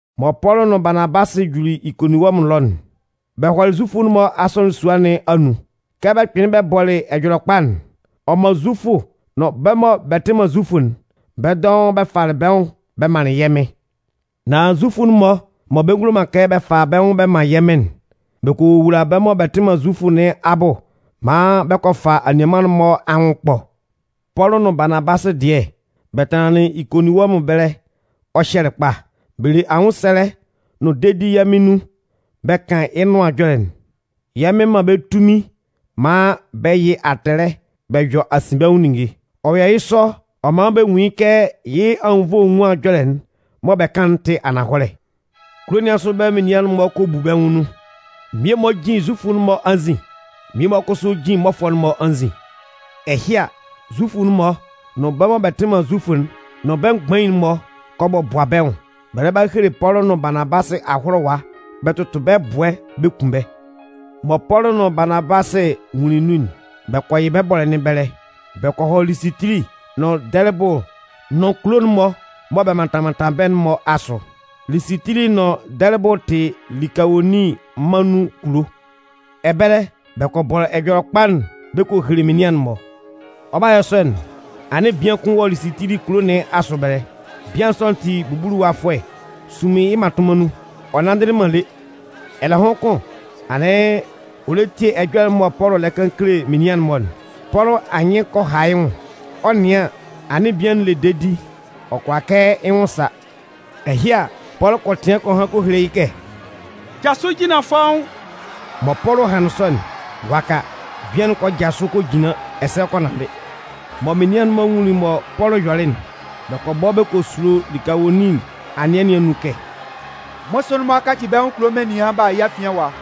Mɔ Pɔlʋ nʋn Baanabasɩ juli Ikoninwɔmʋn ɛlɔ'n, bɛ hɔlɩ Zufʋ'n-mɔ asɔnɩn sua nɩn anun. Kɛ bɛ kpɩnlɩn bɛ bɔlɩ Ɛjɔlɛkpa'n, ɔ man Zufʋ nʋn bɛ́ mɔ bɛ tɩ man Zufʋ'n, bɛ́ dɔʋn bɛ falɩ bɛ́ nwʋn bɛ manlɩn yɛ́ Mɩn. Nan Zufʋ'n-mɔ mɔ bɛ ngulo man kɛ bɛ fa bɛ́ nwʋn bɛ man yɛ́ Mɩn'n, bɛ kɔ wowula bɛ́ mɔ bɛ tɩ man Zufʋ nɩn abʋ maan bɛ kɔ fa anianman'n-mɔ anwʋn ɛkpɔ. Pɔlʋ nʋn Baanabasɩ dɩɛ, bɛ tanlanlɩn Ikoninwɔmʋn ɛbɛlɛ ɔ hyɛlɩ kpa. Bɛ le anwʋnsɛlɛ nʋn dedi yɛ́ Mɩn anun bɛ kan yɩ́ nʋan ɛjɔlɛ'n. Yɛ́ Mɩn man bɛ́ tunmin maan bɛ yɩ atɛlɛ bɛ yɔ asinbɛnwʋn ninnge. Ɔ yɔ yɩ́ sɔ ɔ man bɛ nwun yɩ́ kɛ yɩ́ anwunnvoe enwuan ɛjɔlɛ'n mɔ bɛ kan'n tɩ ananhɔlɛ. Kulo nɩn asʋ ɛbɛlɛ menian'n-mɔ kɔ bu bɛ́ nwʋn nun. Mmie-mɔ jin Zufʋ'n-mɔ anzin, mmie-mɔ kʋsʋ jin mmɔfʋɛ'n-mɔ anzin. Ɛhɩ a, Zufʋ'n-mɔ nʋn bɛ́ mɔ bɛ tɩ man Zufʋ'n nʋn bɛ́ mgbain'n-mɔ kɔ bɔbʋa bɛ́ nwʋn, bɛ lɛ ba hele Pɔlʋ nʋn Baanabasɩ ahʋlʋwa bɛ tʋtʋ bɛ́ ɛbʋɛ bɛ kun bɛ́. Mɔ Pɔlʋ nʋn Baanabasɩ nwunlin nun'n, bɛ kɔ yɩ bɛ́ bɔ́lɛ nɩn ɛbɛlɛ. Bɔ kɔ hɔ Lisitili nʋn Dɛlɩbʋ nʋn kulo'n-mɔ mɔ bɛ mantan mantan bɛ́'n-mɔ asʋ. Lisitili nʋn Dɛlɩbʋ tɩ Likawonin mân nun kulo. Ɛbɛlɛ, bɛ kɔ bɔ Ɛjɔlɛkpa'n bɛ kɔ hele menian'n-mɔ. Ɔ 'ba yɔ sɔ'n, anɩn bian kʋn wɔ Lisitili kulo nɩn asʋ ɛbɛlɛ. Bian sɔ'n tɩ bubuluwafʋɛ sunmin yɩ́ mmatʋnman nun, ɔ nanndɩlɩ man lé. Ɛlɛhʋn kʋn, anɩn ɔ lɛ tie ɛjɔlɛ'n mɔ Pɔlʋ lɛ kan kele menian'n-mɔ'n. Pɔlʋ anyɩn kɔ ha yɩ́ nwʋn. Ɔ 'nɩan an, anɩn bian'n le dedi ɔ kʋala kɛ yɩ́ nwʋn sa. Ɛhɩ a, Pɔlʋ kɔ tɩan kɔ han kɔ hele yɩ́ kɛ: “Jasʋ jinlan fɔ́ʋ́n!” Mɔ Pɔlʋ hanlɩn sɔ'n, waka, bian'n kɔ jasʋ kɔ jinlan ɛsɛ ɔ kɔ nanndɩ. Mɔ Menian'n-mɔ nwunlin mɔ Pɔlʋ yɔlɩ'n, bɛ kɔ bɔ bɛ kɔ sulo Likawonin anɩɛ nɩn anun kɛ: “Mmʋsʋɩn'n-mɔ a kaci bɛ́ nwʋn kulo menian b'a a yɛ́ afian ɛwa!”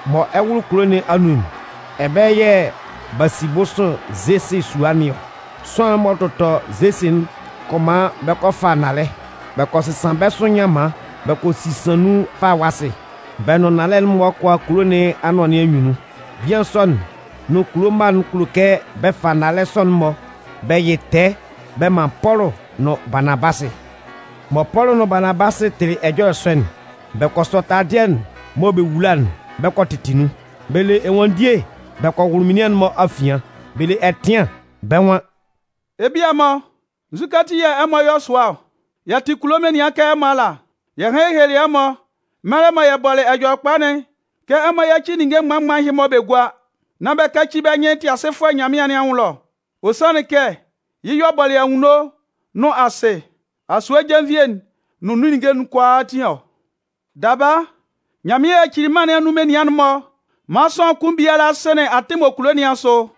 Mɔ ɛ 'wʋlʋ kulo nɩn anun'n, ɛbɛlɛ yɛ̂ b'a si bʋsʋɩn Zesɩ sua nɩn ɔ. Sʋanlan'n m'ɔ tʋtɔ Zesɩ'n kɔ man bɛ kɔ fa nnalɛ. Bɛ kɔ sɩsan bɛ́ sʋ nyanman bɛ kɔ sisan nun falawasɩ. Bɛ nʋn nnalɛ'n-mɔ kɔ a kulo nɩn anʋan nɩn anyunnun. Bian sɔ'n nʋn kulo mma'n kulo kɛ bɛ fa nnalɛ sɔ'n-mɔ bɛ yɩ tɛɛ bɛ man Pɔlʋ nʋn Baanabasɩ. Mɔ Pɔlʋ nʋn Baanabasɩ tɩlɩ ɛjɔlɛ sɔ'n, bɛ kɔ sɔ taladɩɛ'n mɔ bɛ wula'n bɛ kɔ tɩtɩ nun. Bɛ le ɛnwanndie bɛ kɔ wʋlʋ menian'n-mɔ afian. Bɛ le ɛtɩan, bɛ́ nwan: “Ebia-mɔ, nzukɛ ati yɛ̂ ɛmɔ yɔ sʋa ɔ? Yɛ tɩ kulo menian kɛ ɛmɔ ala. Yɛ hanlɩn yɛ helelɩ ɛmɔ, mɛlɛ mɔ yɛ bɔlɩ Ɛjɔlɛkpa'n kɛ ɛmɔ yáci ninnge mgban mgban ɛhɩ-mɔ bɛ gúa. Nán bɛ káci bɛ́ nyɩn Tɩasɩfʋɛ Nyanmɩan nɩn anwʋn ɛlɔ. Ɔ sanlɩn kɛ yɩ́ y'ɔ bɔlɩ anwunno nʋn asɩ, asue jenvie'n nʋn nun ninnge'n kʋalaatin ɔ. Daba, Nyanmɩan yacili mân nɩn anun menian'n-mɔ maan sʋanlan kʋn biala sɩnlɩn atɩn m'ɔ kulo nɩn asʋ.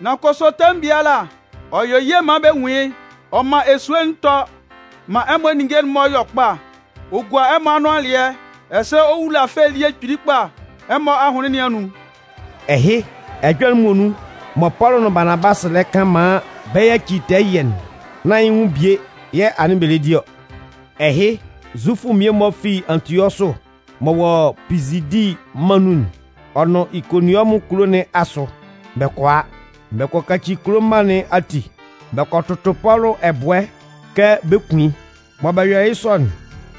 Nan kʋsʋ tɛmʋn biala ɔ yɔ ye maan bɛ nwun yɩ́. Ɔ man esue'n tɔ maan ɛmɔ ninnge'n-mɔ yɔ kpa. Ɔ gua ɛmɔ anʋan alɩɛ ɛsɛ ɔ wula fɛ elie kpili kpa ɛmɔ ahʋnlɩn nɩn anun.” Ɛhɩ, ɛjɔlɛ'n muonun mɔ Pɔlʋ nʋn Baanabasɩ lɛ kan maan bɛ yacɩ tɛɛ ɛyɩɛ'n, nán yɩ́ nwʋn bie yɛ̂ anɩn bɛ lɛ di ɔ. Ɛhɩ, Zufʋ mmie-mɔ fi Antiɔsʋ m'ɔ wɔ Pizidi mân nun'n, ɔ nʋn Ikoninwɔmʋn kulo nɩn asʋ, bɛ kɔ a. Bɛ kɔ kaci kulo mma nɩn ati. Bɛ kɔ tʋtʋ Pɔlʋ ɛbʋɛ kɛ bɛ 'kun yɩ́. Mɔ bɛ yɔlɩ yɩ́ sɔ'n,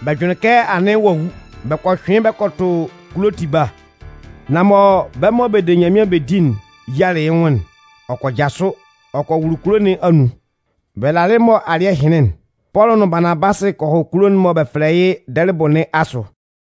bɛ jʋnlɩn kɛ anɩn ɔ'a wu. Bɛ kɔ hyʋɩn yɩ́ bɛ kɔ tʋ kulo tiba. Nan mɔ bɛ́ mɔ bɛ de Nyanmɩan bɛ di'n yialɩ yɩ́ nwʋn'n, ɔ kɔ jasʋ, ɔ kɔ wʋlʋ kulo nɩn anun. Bɛ lalɩ mɔ alɩ́ɛ hɩnlɩn'n, Pɔlʋ nʋn Baanabasɩ kɔ hɔ kulo'n mɔ bɛ fɛlɛ yɩ́ Dɛlɩbʋ nɩn asʋ.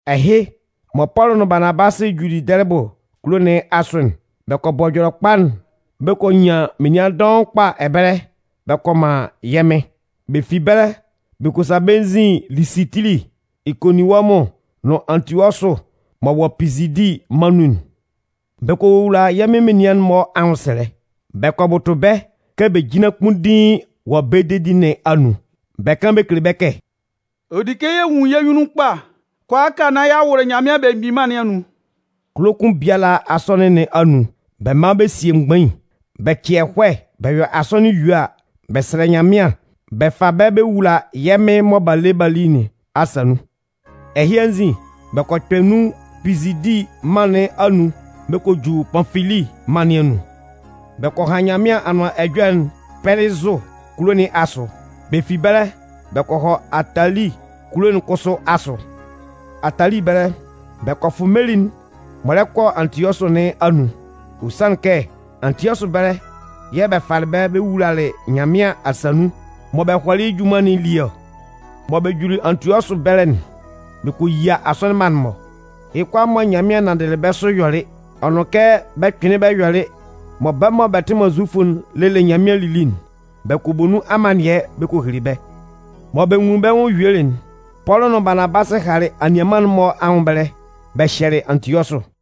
Ɛhɩ, mɔ Pɔlʋ nʋn Baanabasɩ juli Dɛlɩbʋ kulo nɩn asʋ'n, bɛ kɔ bɔ Ɛjɔlɛkpa'n bɛ kɔ nyan menian dɔʋn kpa ɛbɛlɛ bɛ kɔ man yɛ́ Mɩn. Bɛ fi ɛbɛlɛ bɛ kɔ sa bɛ́ nzin Lisitili, Ikoninwɔmʋn nʋn Antiɔsʋ m'ɔ wɔ Pizidi mân nun'n. Bɛ kɔ wowula yɛ́ Mɩn menian'n-mɔ anwʋnsɛlɛ, bɛ kɔ bʋtʋ bɛ́ kɛ bɛ jínlan kpunndiin wɔ bɛ́ dedi nɩn anun. Bɛ kan bɛ kele bɛ́ kɛ: “Ɔ di kɛ yɛ nwun yɛ́ nyunnun kpa kʋalaaka nán y'a wʋlʋ Nyanmɩan Belemgbin Mân nɩn anun.” Kulo kʋn biala asɔnɩn nɩn anun, bɛ man bɛ sie mgbain. Bɛ cɩ ɛhɔɛ bɛ yɔ asɔnɩn yue a, bɛ sɛlɛ Nyanmɩan bɛ fa bɛ́ bɛ wula yɛ́ Mɩn mɔ b'a le yɩ́ b'a li nɩn asa nun. Ɛhɩ anzin, bɛ kɔ kpɛ nun Pizidi mân nɩn anun bɛ kɔ ju Panfili mân nɩn anun. Bɛ kɔ han Nyanmɩan Anʋan Ɛjɔlɛ'n Pɛlɩzʋ kulo nɩn asʋ. Bɛ fi ɛbɛlɛ, bɛ kɔ hɔ Atali kulo'n kʋsʋ asʋ. Atali ɛbɛlɛ, bɛ kɔ fʋ meli'n m'ɔ lɛ kɔ Antiɔsʋ nɩn anun. Ɔ sanlɩn kɛ Antiɔsʋ ɛbɛlɛ yɛ̂ bɛ falɩ bɛ́ bɛ wulalɩ Nyanmɩan asa nun mɔ bɛ hɔlɩ yɩ́ junman nɩn elie ɔ. Mɔ bɛ juli Antiɔsʋ ɛbɛlɛ'n, bɛ kɔ yia asɔnɩn mma'n-mɔ. Yɩ́ kʋalaa mɔ Nyanmɩan nanndɩlɩ bɛ́ sʋ ɔ yɔlɩ, ɔ nʋn kɛ ɔ kpɩnlɩn yɔlɩ mɔ bɛ́ mɔ bɛ tɩ man Zufʋ'n lelɩ Nyanmɩan lili'n, bɛ kɔ bɔ nun amannɩɛ bɛ kɔ hele bɛ́. Mɔ bɛ nwunlin bɛ́ nwʋn yuelɩ'n, Pɔlʋ nʋn Baanabasɩ halɩ anianman'n-mɔ anwʋn ɛbɛlɛ, bɛ hyɛlɩ Antiɔsʋ.